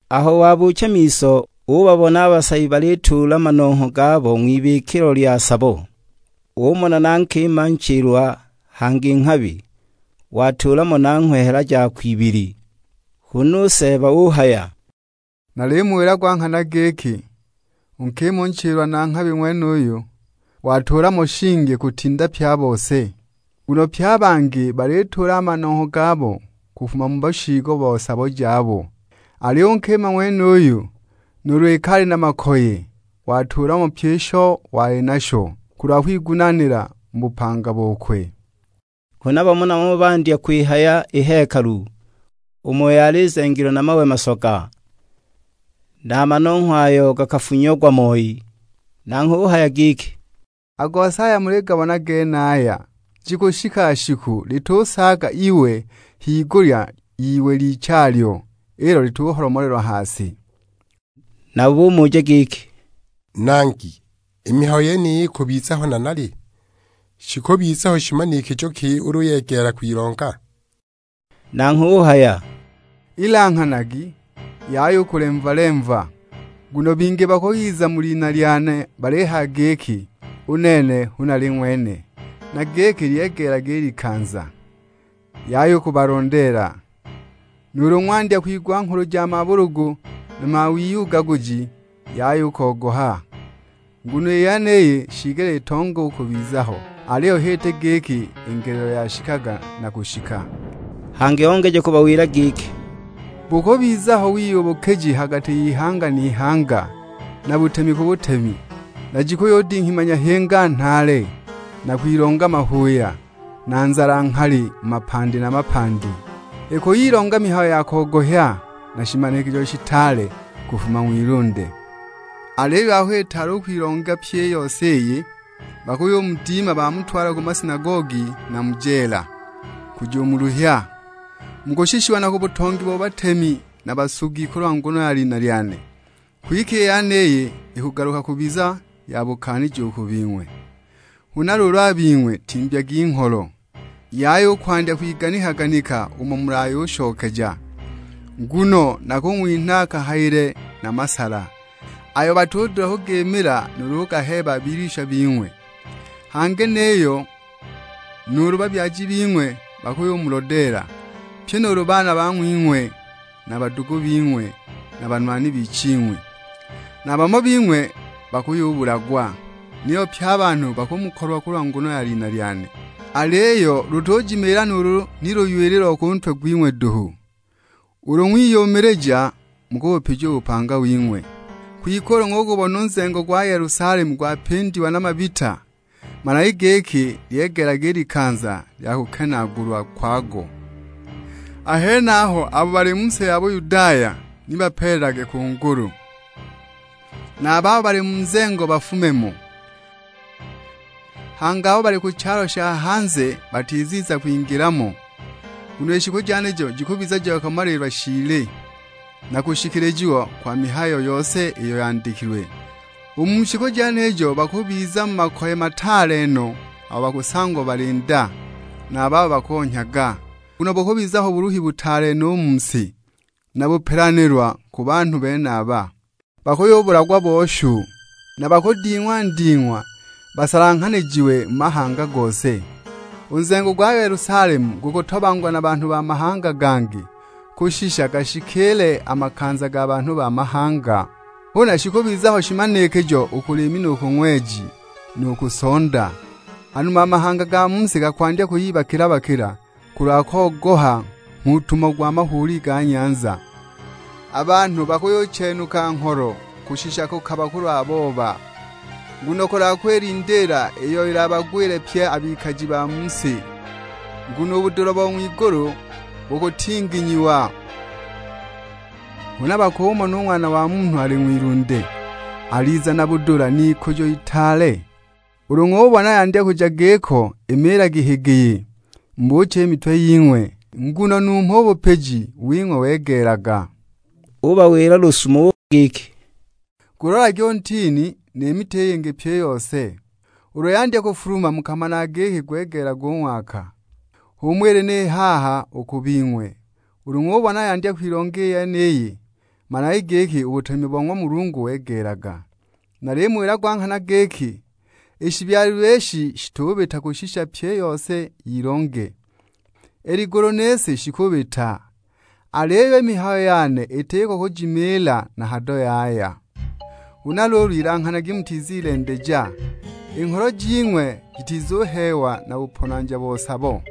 Aho wabuucha miso, ubabona a basabi balituula manongho gabo ng'wibikilo lya sabo. Umona na nkima nchilwa hangi nghabi, watuula mo nanghwe hela jakwe ibili. Huna u Seeba uhaya, "Nalimuwila gwa nghana giki, u nkima u nchilwa na nghabi ng'wenuyu, watuula mo shingi kutinda pye a bose. Nguno pye a bangi balituula a manongho gabo kufuma mu bushiigo bo sabo jabo, aliyo u nkima ng'wenuyu, nuulu iki ali na makoye, watuula mo pyi isho wali nasho, kulwa kwigunaanila mu bupanga bokwe." Huna bamo na bamo bandya kwihaya i hekalu, umo yali izengilwe na mawe masoga; na a manongho ayo gafunyiagwa moi. Nanghwe uhaya giki, "A gose aya muligabona genaya, jikushika shiku litusaaga iwe higulya y'iwe lichalyo, ilo lituholomolelwa ha si!" Nabo bumuja giki, "Nangi, i mihayo yeniyi ikubiza ho nanali? Shikubiza ho shimanikijo ki ulu yegeela kwilonga?" Nanghwe uhaya, "Ilanghanagi, yaya u kulemva-lemva. Nguno bingi bakuyiza mu lina lyane balihaya giki, 'U nene hu nali ng'wene;' na giki, 'Lyegeelaga i likanza.' Yaya u kubalondeela. Nuulu ng'wandya kwigwa nghulu ja mabulugu na mawiyugaguji, yaya u kogoha, nguno i yeniyi shiigelile itonge u kubiza ho, aliyo h'iti giki i ngelelo yashikaga na kushika." Hangi ongeja kubawila giki, "Bukubiza ho wiyubukiji ha gati y'ihanga n'ihanga, na butemi ku butemi. Na jikuyudinghima nyahinga nhaale, na kwilonga mahuuya, na nzala nghali mu mapandi na mapandi. Ikuyilonga mihayo ya kogohya, na shimanikijo shitaale kufuma ng'wilunde. Aliyo aho itaali u kwilonga pyi i yose iyi, bakuyumudima bamutwala ku masinagogi na mu jeela, kujumuluhya; mukushishiwa na ku butongi bo batemi na basugi kulwa nguno ya lina lyane. Kwike i yeniyi ikugaluka kubiza ya bukaaniji u ku bing'we. Huna luulu a bing'we timbyagi ngholo, yaya u kwandya kwiganika-ganika umo mulayushokeja. Nguno nakung'winha kahayile na masala, ayo batudula kugimila nuulu kugaheeba a bilwisha bing'we. Hangi niyo nuulu babyaji bing'we bakuyumulodeela, pye nuulu baana bang'wing'we na a badugu bing'we na a banwani biching'wi; na bamo bing'we bakuyubulagwa. Niyo pye a banhu bakumukolwa kulwa nguno ya lina lyane. Aliyo lutujimiila nuulu ni luywili lo ku ntwe gwing'we duhu. Ulu ng'wiyumilija, mukubupija u bupanga wing'we." "Kwike ulu ng'ugubona u nzengo gwa Yelusalemu gwapindiwa na mabita, managi giki lyegeelaga i likanza lya kukenaagulwa kwago. A henaho abo bali mu si ya Buyudaya ni bapeelelage ku ngulu; na a babo bali mu nzengo bafume mo, hangi abo bali ku chalo sha hanze batiziza kwingila mo. Nguno i shiku jenijo jikubiza ja kumalilwa shiili, na kushikilijiwa kwa mihayo yose iyo yandikilwe. U mu shiku jenijo bakubiza mu makoye mataale no abo bakusangwa bali nda, na a babo bakonhyaga. Nguno bukubiza ho buluhi butaale no u mu si, na bupelanilwa u ku banhu benaba. Bakuyubulagwa bo shu, na bakuding'wa nding'wa basalanghanijiwe mu mahanga gose. U nzengo gwa Yelusalemu gukutobangwa na banhu ba mahanga gangi kushisha gashikiile a makanza ga banhu ba mahanga!" "Huna shikubiza ho shimanikijo u ku liimi nu ku ng'weji, nu ku sonda. Hanuma a mahanga ga mu si gakwandya kuyibakila-bakila, kulwa kogoha nghuutumo gwa mahuuli ga nyanza. A banhu bakuyuchenuka ngholo kushisha kukaba kulwa boba, nguno ya kwilindiila iyo ilabagwile pye a bikaji ba mu si. Nguno u budula bo ng'wigulu bukutinginyiwa; huna bakumona u Ng'wana wa Munhu ali ng'wilunde, aliza na budula n'ikujo itaale. Ulu ng'ubona yandya kuja giko, imiilagi higiyi, mubuuche i mitwe ying'we, nguno numho u bupiji wing'we wegeelaga." Ubawila lusumo giki, "Gulolagi u ntini, ni miti i yingi pyi i yose. Ulu yandya kufuluma mukamanaga giki gwegeelaga u ng'waka. H'umo ili ni haha u ku bing'we; ulu ng'ubona yandya kwilonga i yeniyi, managi giki u butemi bo ng'wa Mulungu wegeelaga. Nalimuwila gwa nghana giki, i shibyalilwe ishi shitubita kushisha pyi i yose yilonge. I ligulu ni si shikubita, aliyo i mihayo yane itiko kujimiila na hado yaya!" "Huna luulu ilanghanagi mutizilendeja, i ngholo jing'we jitizuheewa na buponanja bo sabo,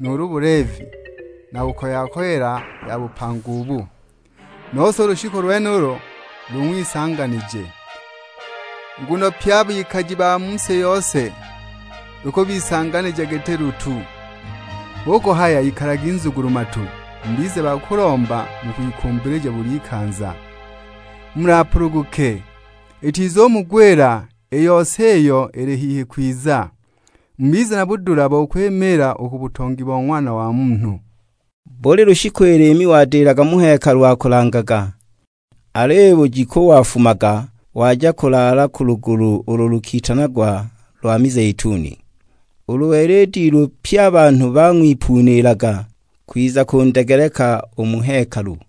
nuulu buleevi na kukoya-koyela ya bupanga ubu, nose u lushiku lwenulo lung'wisanganije. Nguno pye a bikaji ba mu si yose lukubisanganija, giti lutu. Hu kuhaya ikalagi nzugulu-matu, mubize ba kulomba mu kwikumbilija buli ikanza, mulapuluguke; itizumugwila i yose iyo ili hihi kwiza. Mubize na budula bo kwimiila u ku butongi bo Ng'wana wa Munhu." Buli lushiku i liimi wadilaga mu hekalu akulangaga, aliyo i bujiku wafumaga waja kulaala ku lugulu ulo lukitanagwa lwa mizeituni. Ulu wela i dilu pye a banhu bang'wipuniilaga, kwiza kundegeleka u mu hekalu.